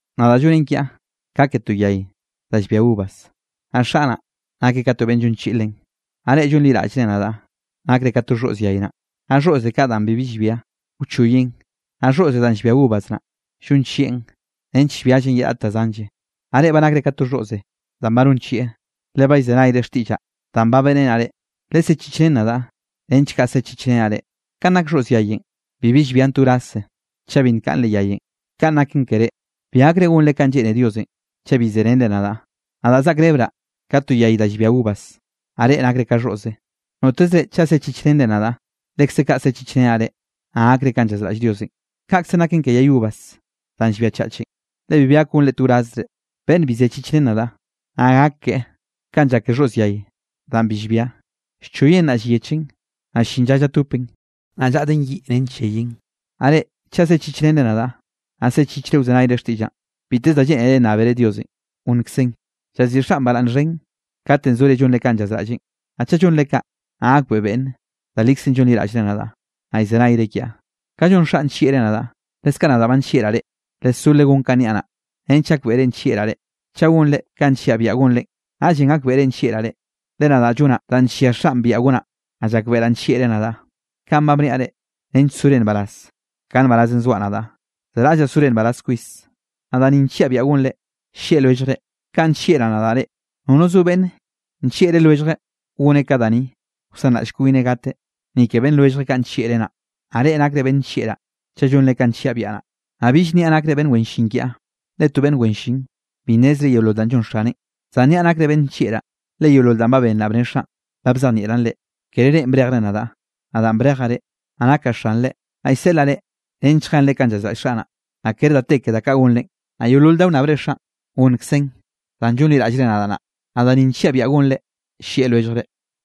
’Nadaꞌ llonen kiaꞌ ka ke to yay da llbia uvas, naꞌ Xaꞌ naꞌ, nakeꞌ ka to beꞌnn llonchiꞌi len. Naꞌ reꞌ llonliraꞌllre nadaꞌ, nakre ka to xhoꞌz yay naꞌ. Naꞌ xhoꞌze kaꞌ danꞌ bibi llbianꞌ, wchoyeꞌn. Naꞌ xhoꞌze danꞌ llbia uvas naꞌ, llonchieꞌn nench llbiallen ye raꞌt da zanlle. Naꞌ reꞌ ba nakre ka to xhoꞌze danꞌ ba nonchieꞌ, le ba llzenayre xtiꞌllaꞌ danꞌ ba beꞌrenaꞌ reꞌ. Lesechichrén nadaꞌ nench kaꞌ sechichrenaꞌ reꞌ. Kanꞌ nak xhoꞌz yayenꞌ, bibi llbian to wraze chaꞌ bi nkaꞌn leꞌ yayenꞌ, kaꞌn naken ke reꞌ, bi gakre gonre kanꞌ lleꞌne Diosenꞌ, chaꞌ bi serenre nadaꞌ. ’Nadaꞌ zaꞌkrebraꞌ ka to yay da llbia uvas, naꞌ reꞌ nakre ka xhoꞌze. Notezre chaꞌ sechichrenre nadaꞌ, lekze kaꞌ sechichrenaꞌ reꞌ, naꞌ gakre kanꞌ llazraꞌll Diosenꞌ, kaꞌkzenꞌ naken ke yay uvas danꞌ llbiachachen, le bibi gak gonre to wrazzre. Beꞌnn bi sechichreneꞌ nadaꞌ, naꞌ gak keꞌe kanꞌ llak ke xhoꞌz yay danꞌ bi llbia, llchoyeꞌn naꞌ llyechen, naꞌ ll-llin lla llatopeꞌn, naꞌ llaꞌden yiꞌ nench lleyen. ’Naꞌ reꞌ chaꞌ sechichrenre nadaꞌ, naꞌ zechichre wzenayre xtiꞌllaꞌn, biteze da lleꞌnere nnábere Diosenꞌ, gonnkzeꞌn. Llaziꞌi Xaꞌn baraꞌnn xhen kate zore llonre kanꞌ llazraꞌlleꞌn, naꞌ chaꞌ llonre kaꞌ, naꞌ gakbeꞌe beꞌnne da likzenꞌ llonliraꞌllre nadaꞌ, naꞌ llzenayre kiaꞌ. Kanꞌ llon Xaꞌn nllieꞌreꞌ nadaꞌ, leskaꞌ nadaꞌ ba nllieꞌraꞌ reꞌ. Lesó legón kanꞌ niaꞌ naꞌ, nench gakbeꞌre nllieꞌraꞌ reꞌ. Chaꞌ gonre kanꞌ nlliaꞌ biaꞌa gonre, naꞌllenꞌ gakbeꞌre nllieꞌraꞌ reꞌ, le nadaꞌ llonaꞌ danꞌ nllia Xaꞌn biaꞌa gonaꞌ, naꞌ llakbeꞌraꞌ nllieꞌreꞌ nadaꞌ. ’Kaꞌn ba bniaꞌ reꞌ, nench sore nbaraz ka nbarazenꞌ zoaꞌ nadaꞌ. Zeraꞌllaꞌ sore nbaraz kwis. Naꞌ da ni nlliaꞌ biaꞌa gonrenꞌ, llieꞌ lwelljre kanꞌ nllieꞌraꞌ nadaꞌ reꞌ. Nono zo beꞌnne nllieꞌllre lwelljeꞌ goneꞌ ka da ni, wsanraꞌll kwineꞌ gateꞌ, ni ke beꞌnn lwelljeꞌ kaꞌ nllieꞌreꞌ naꞌ. Naꞌ reꞌ nakre beꞌnn nllieꞌraꞌ chaꞌ llonre kanꞌ nlliaꞌ biaꞌa naꞌ. Naꞌ bill niaꞌ nakre beꞌnn wen llin kiaꞌ, le to beꞌnn wen llin, bi nnezreꞌ yeolol danꞌ llon xaneꞌn, zan niaꞌ nakre beꞌnn nllieꞌraꞌ, le yeolol danꞌ ba benraꞌ bne Xaꞌn, ba bzejnieꞌraꞌn reꞌ. Kere reꞌn brejre nadaꞌ, nadaꞌn brejaꞌ reꞌ, naꞌ nakaꞌ xanrenꞌ. Naꞌ llseꞌlaꞌ reꞌ nench lljenre kanꞌ llazraꞌll Xaꞌ naꞌ, naꞌ kere da te ke da kaꞌ gonrenꞌ. Naꞌ yeolol da wnnábere Xaꞌn, gonkzeꞌn danꞌ llonliraꞌllre nadaꞌ naꞌ. Naꞌ da ni nlliaꞌ biaꞌa gonre, llieꞌ lwelljre.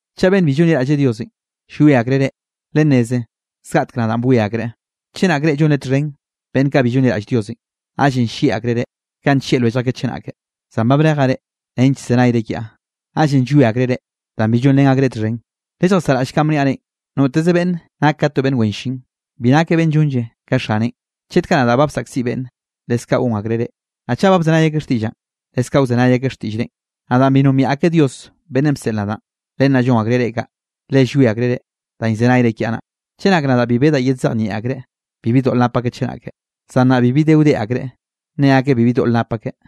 ’Chaꞌ beꞌnn bi llonliraꞌlle Diosenꞌ, llwie akreꞌ reꞌ, lenneze zgaꞌtek nadaꞌn bwie akreꞌ. Chenak reꞌ llonre txhen beꞌnn kaꞌ bi llonliraꞌll Diosenꞌ, naꞌllenꞌ llieꞌ akreꞌ reꞌ, kanꞌ nllieꞌ lwellj akeꞌ chenake. Zan ba brejaꞌ reꞌ nench llzenayre kiaꞌ, naꞌllenꞌ llwie akreꞌ reꞌ, danꞌ bi llonrén akreꞌ txhen. Lelljasaꞌraꞌll kanꞌ bniaꞌ reꞌn: “Noteze beꞌnn nak ka to beꞌnn wen llin, bi nakeꞌ beꞌnn llonlle ka xaneꞌn.” Chet kaꞌ nadaꞌ ba bsaꞌkziꞌ beꞌnn, leskaꞌ gon akreꞌ reꞌ. Naꞌ chaꞌ ba bzenay akeꞌ xtiꞌllaꞌn, leskaꞌ wzenay akeꞌ xtiꞌll reꞌn. Naꞌ danꞌ bi nombiaꞌ akeꞌ Dios beꞌnnenꞌ bseꞌl nadaꞌn, len naꞌ llon akreꞌ reꞌ kaꞌ, le llwie akreꞌ reꞌ, danꞌ llzenayre kiaꞌ naꞌ. ’Chenak nadaꞌ bi bedaꞌ yedzejnieꞌ akreꞌ, bibi doꞌl nap akeꞌ chenake. Zan nnaꞌ bibi de wde akreꞌ, ne akeꞌ bibi doꞌl nap akeꞌ.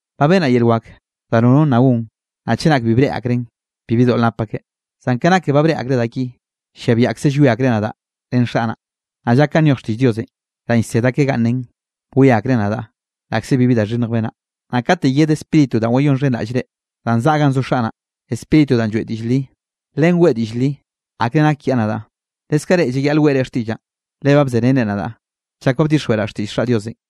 Ba benaꞌ yel wak da nono nna gon, naꞌ chenak bi breꞌe akreꞌn, bibi doꞌl nap akeꞌ. Zan ka naken ba breꞌe akreꞌ da ki, llia biaꞌkze llwie akreꞌ nadaꞌ ren Xaꞌ naꞌ. Naꞌ llak kanꞌ nyoj xtiꞌll Diosenꞌ danꞌ llsed akeꞌ ganꞌ nen: “Bwie akreꞌ nadaꞌ, laꞌkze bibi da xhinnj benaꞌ.” ’Naꞌ katenꞌ yed Spíritu danꞌ wayonxhenraꞌll reꞌ, danꞌ zaꞌa ganꞌ zo Xaꞌ naꞌ, Spíritu danꞌ lloeꞌ diꞌll li, len weꞌe diꞌll li akre nak kiaꞌ nadaꞌ. Leskaꞌ reꞌ llayaꞌle weꞌre xtiꞌllaꞌn, le ba bzerenre nadaꞌ chak ba bdixjweꞌraꞌ xtiꞌll Xaꞌ Diosenꞌ.